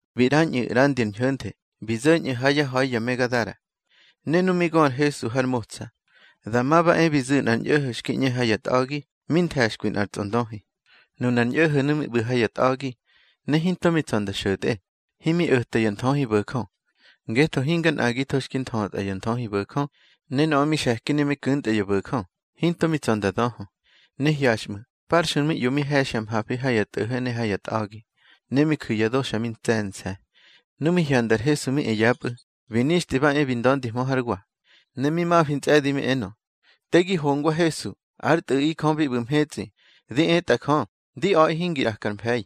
Bi ꞌrañꞌu̱ ꞌrandi ar ñho̱nthe, bi zo̱ñꞌu̱ ha yá ha̱i ya me Gadara. Ne nu mi gö ar Hesu har motsa, dama ba e bi zu̱ nꞌar ñꞌo̱ho̱ xki ꞌñe ha ya tꞌa̱gi, mi nthe̱xkwi nꞌar tsꞌondöhi. Nunar ñꞌo̱ho̱nu̱ mi ꞌbu̱ ha ya tꞌa̱gi, ne hinto mi tsa̱ nda xo̱tꞌe, himi o̱ta ya nthöhibo̱jö. Ngetho hinga nꞌagitho xki nthötꞌa ya nthöhibo̱jö, ne nöꞌö mi xe̱ki ne mi ku̱ntꞌa ya bo̱jö, hinto mi tsa̱ nda döhö. Ne hyaxꞌmu̱, parxui mi ꞌyo mi he̱xya mhafi ha ya tꞌo̱ho̱ ne ha ya tꞌa̱gi, ne mi ju̱ ya do xa mi ntse̱nse̱. Nu mi hyanda ar Hesu mi e yapꞌu̱, bi nixtꞌi ba e bi nda̱ndihmö hár wa. Ne mi mafi ntsꞌe̱di mi enö: —Te gi hongwa Hesu, ár Tꞌu̱ꞌi Jö bi ꞌbu̱ mhetsꞌi. Di etꞌa Jö, di a̱ꞌi hingi ꞌraka ar mfe̱i.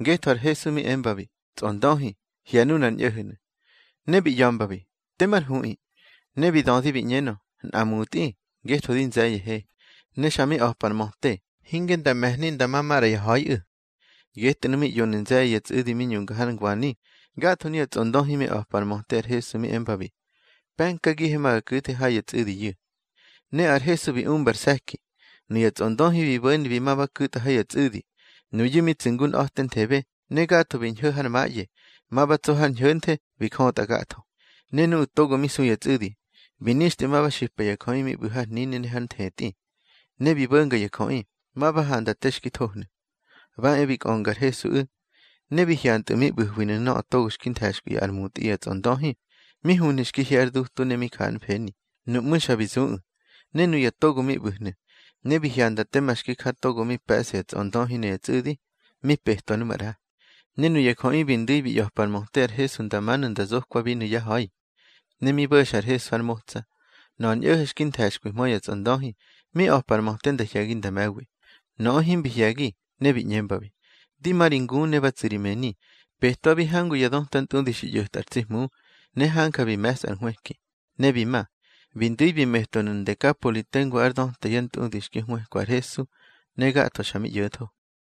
Ngetho ar Hesu mi embabi: —Tsꞌondöhi, hye̱ nunar ñꞌo̱ho̱nu̱. Ne bi ꞌya̱mbabi: —Temar huꞌi. Ne bi dödi bi ꞌñenö: —Nꞌa mutꞌi, ngetho di nze̱ye̱he. Ne xa mi a̱pa ar möte, hinge nda me̱hni nda ma maꞌra ya ha̱iꞌu̱. Getꞌu̱nu̱ mi ꞌyonu̱ nze̱ye̱ ya tsꞌu̱di mi ñunga har ngwani. Gatho nuya tsꞌondöhi mi a̱pa ar möte ar Hesu mi embabi: —Pe̱nkagihe ma ga ku̱the ha ya tsꞌu̱diyu̱. Ne ar Hesu bi umba ar se̱ki. Nuya tsꞌondöhi bi bo̱ni bi ma ba ku̱tꞌa ha ya tsꞌu̱di. Nuyu̱ mi tsu̱ ngu nꞌa̱tenthebe, ne gatho bi ñho̱ har maꞌye, ma ba tso har ñho̱nthe, bi jötꞌa gatho. Ne nuꞌu̱ togo mi su ya tsꞌu̱di, bi nixtꞌi ma ba xipa ya jöꞌi mi ꞌbu̱ har hnini ne har nthetꞌi. Ne bi bo̱nga ya jöꞌi, ma ba handa te xki thohnu̱. Ba e bi kꞌönga ar Hesuꞌu̱, ne bi hyantꞌu̱ mi ꞌbu̱hwinu̱ nöꞌö togo xki nthe̱xkwi ár mutꞌi ya tsꞌondöhi, mi huhnu̱ xki hye ár dutu ne mi ja ár mfeni. Nuꞌmú̱, xa bi zuꞌu̱. Ne nuya togo mi ꞌbu̱hnu̱, ne bi hyanda tema xki ja nöꞌö togo mi pe̱ꞌsa ya tsꞌondöhi ne ya tsꞌu̱di, mi petwa nu maꞌra. Ne nuya jöꞌi bi ndu̱i bi ꞌya̱pa ar möte ar Hesu nda manu̱ nda zokwabinu̱ yá ha̱i. Ne mi bo̱xa ar Hesu har motsa, nöꞌö ar ñꞌo̱ho̱ xki nthe̱xkwihmö ya tsꞌondöhi, mi a̱pa ar möte nda hye̱gi nda me̱wi. Nöꞌö himbi hye̱gi, ne bi ꞌñembabi: —Di ma ri ngu ne ba tsu̱ ri mëni. Petwabi hangu ya döta ntꞌudi xi ꞌyo̱tꞌa ar tsi Hmu, ne hanja xi me̱sꞌa ar nhwëki. Ne bi ma, bi ndu̱i bi metwanu̱ Ndekapoli tengu ár döta ya ntꞌudi xki hwëkwa ar Hesu, ne gatho xa mi ꞌyo̱tho.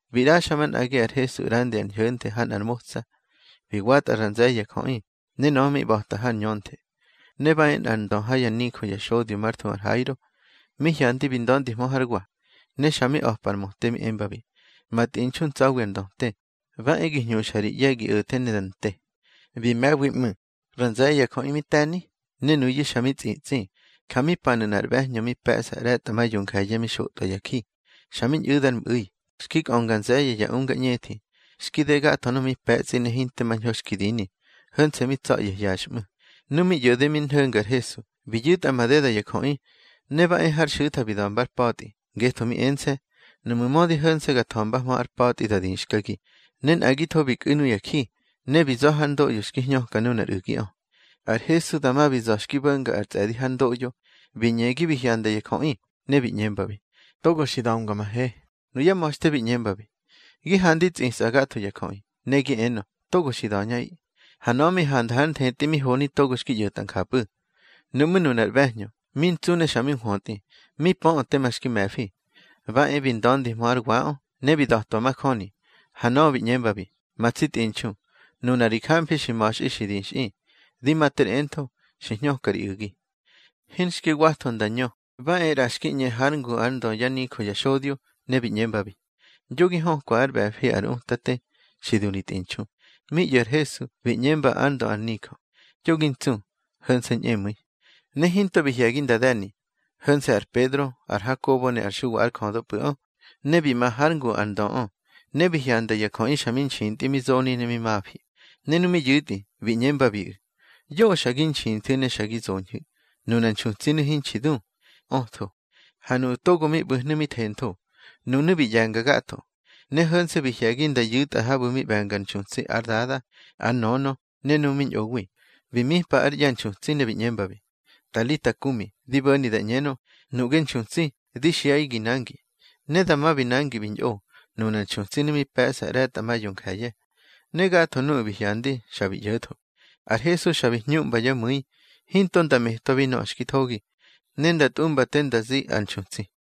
Bi ꞌraxa manꞌagi ar Hesu ꞌrandi ar ñho̱nthe ha nꞌar motsa. Bi watꞌa ra nze̱ye̱ ya jöꞌi, ne nöꞌö mi ꞌba̱ta har ñönthe. Ne ba e nꞌar ndö ha yá nijö ya xodyo mar thuhu ar Hairo, mi hyandi bi nda̱ndihmö hár wa. Ne xa mi a̱pa ar möte mi embabi: —Ma tꞌinxu ntsa̱wi ar ndöte. Ba e gi hñuxa ri ꞌye̱ gi o̱the ne da nte. Bi me̱wi ꞌmu̱. Ra nze̱ye̱ ya jöꞌi mi te̱ni, ne nuyu̱ xa mi tsꞌitsꞌi. Ja mi panu̱ nꞌar ꞌbe̱hñö mi pe̱ꞌsa ꞌre̱tꞌa ma yonje̱ye̱ mi xotꞌwa ya ji. Xa mi ñꞌu̱da ár mꞌu̱i. Xki kꞌönga nze̱ye̱ ya unga ñꞌethi, xki de gatho nöꞌö mi pe̱tsꞌi ne hinte mañho xki dini, ho̱nse̱ mi tsa̱ꞌye̱ hyaxꞌmu̱. Nu mi ꞌyo̱de mi nho̱nga ar Hesu, bi yu̱tꞌa madeda ya jöꞌi, ne ba e hár xu̱tha bi da̱mba ár patꞌi. Ngetho mi ense̱: Nuꞌmu̱ mödi ho̱nse̱ ga tha̱mbahmö ár patꞌi, da dixkagi. Ne nꞌagitho bi kꞌu̱ nuya ji, ne bi za̱ hár ndoꞌyo xki hñöka nunar u̱giꞌö. Ar Hesu dama bi za̱ xki bo̱nga ar tsꞌe̱di hár ndoꞌyo, bi ñegi bi hyanda ya jöꞌi, ne bi ꞌñembabi: —Togo xi da̱mga ma he. Nuyá ma̱xte bi ꞌñembabi: —Gi handi tsꞌisꞌa gatho ya jöꞌi, ne gi enö: Togo xi da̱ñꞌaꞌi. Ha nöꞌö mi handa hár nthetꞌi mi honi togo xki ꞌyo̱tꞌa njapꞌu̱. Nuꞌmú̱ nunar ꞌbe̱hñö, mi ntsu ne xa mi nhwötꞌi, mi pöꞌö tema xki me̱fi, ba e bi nda̱ndihmö hár waꞌö, ne bi da̱twa majöni. Ha nöꞌö bi ꞌñembabi: —Ma tsi tꞌinxu, nuna ri jamfi xi ma̱xꞌi xi dixꞌi. Di ma ter entho, xi hñöka ri u̱gi. Hinxki watho nda ñö, ba e ꞌra xki ꞌñe hár ngu ár ndö yá nijö ya xodyo, ne bi ꞌñembabi: —Yo gi hökwa ár ꞌbe̱fi ar Utate. Xi du ri tꞌinxu. Mi ꞌyo̱ ar Hesu, bi ꞌñemba ár ndö ar nijö: —Yo gi ntsu. Ho̱nse̱ ñꞌemu̱i. Ne hinto bi hye̱gi nda de̱ni, ho̱nse̱ ar Pedro, ar Hakobo ne ar Xuwa ár jödöpꞌu̱ꞌö. Ne bi ma hár ngu ar ndöꞌö, ne bi hyanda ya jöꞌi xa mi nxintꞌi mi zoni ne mi mafi. Ne nu mi yu̱tꞌi, bi ꞌñembabiꞌu̱: —Yoꞌö xa gi nxinthu̱ ne xa gi zoñhu̱. Nunar nxutsinu̱ hinxi du, ötho. Ha nuꞌu̱ togo mi ꞌbu̱hnu̱ mi thentho. Nunu̱ bi ꞌye̱nga gatho, ne ho̱nse̱ bi hye̱gi nda yu̱tꞌa habu̱ mi ꞌbe̱ngar nxutsi ár dada, ár nönö ne nuꞌu̱ mi ñꞌowi. Bi mipa ár ꞌye̱ ar nxutsi, ne bi ꞌñembabi: —Talita kumi —di bo̱ni da ꞌñenö: Nuꞌge nxutsi, di xiꞌaꞌi gi nangi. Ne dama bi nangi bi ñꞌo. Nunar nxutsinu̱ mi pe̱ꞌsa ꞌre̱tꞌa ma yonje̱ye̱. Ne gatho nuꞌu̱ bi hyandi, xa bi ꞌyo̱tho. Ar Hesu xa bi hñuꞌmba yá mu̱i, hinto nda metwabi nöꞌö xki thogi, ne nda tꞌumba te nda zi ar nxutsi.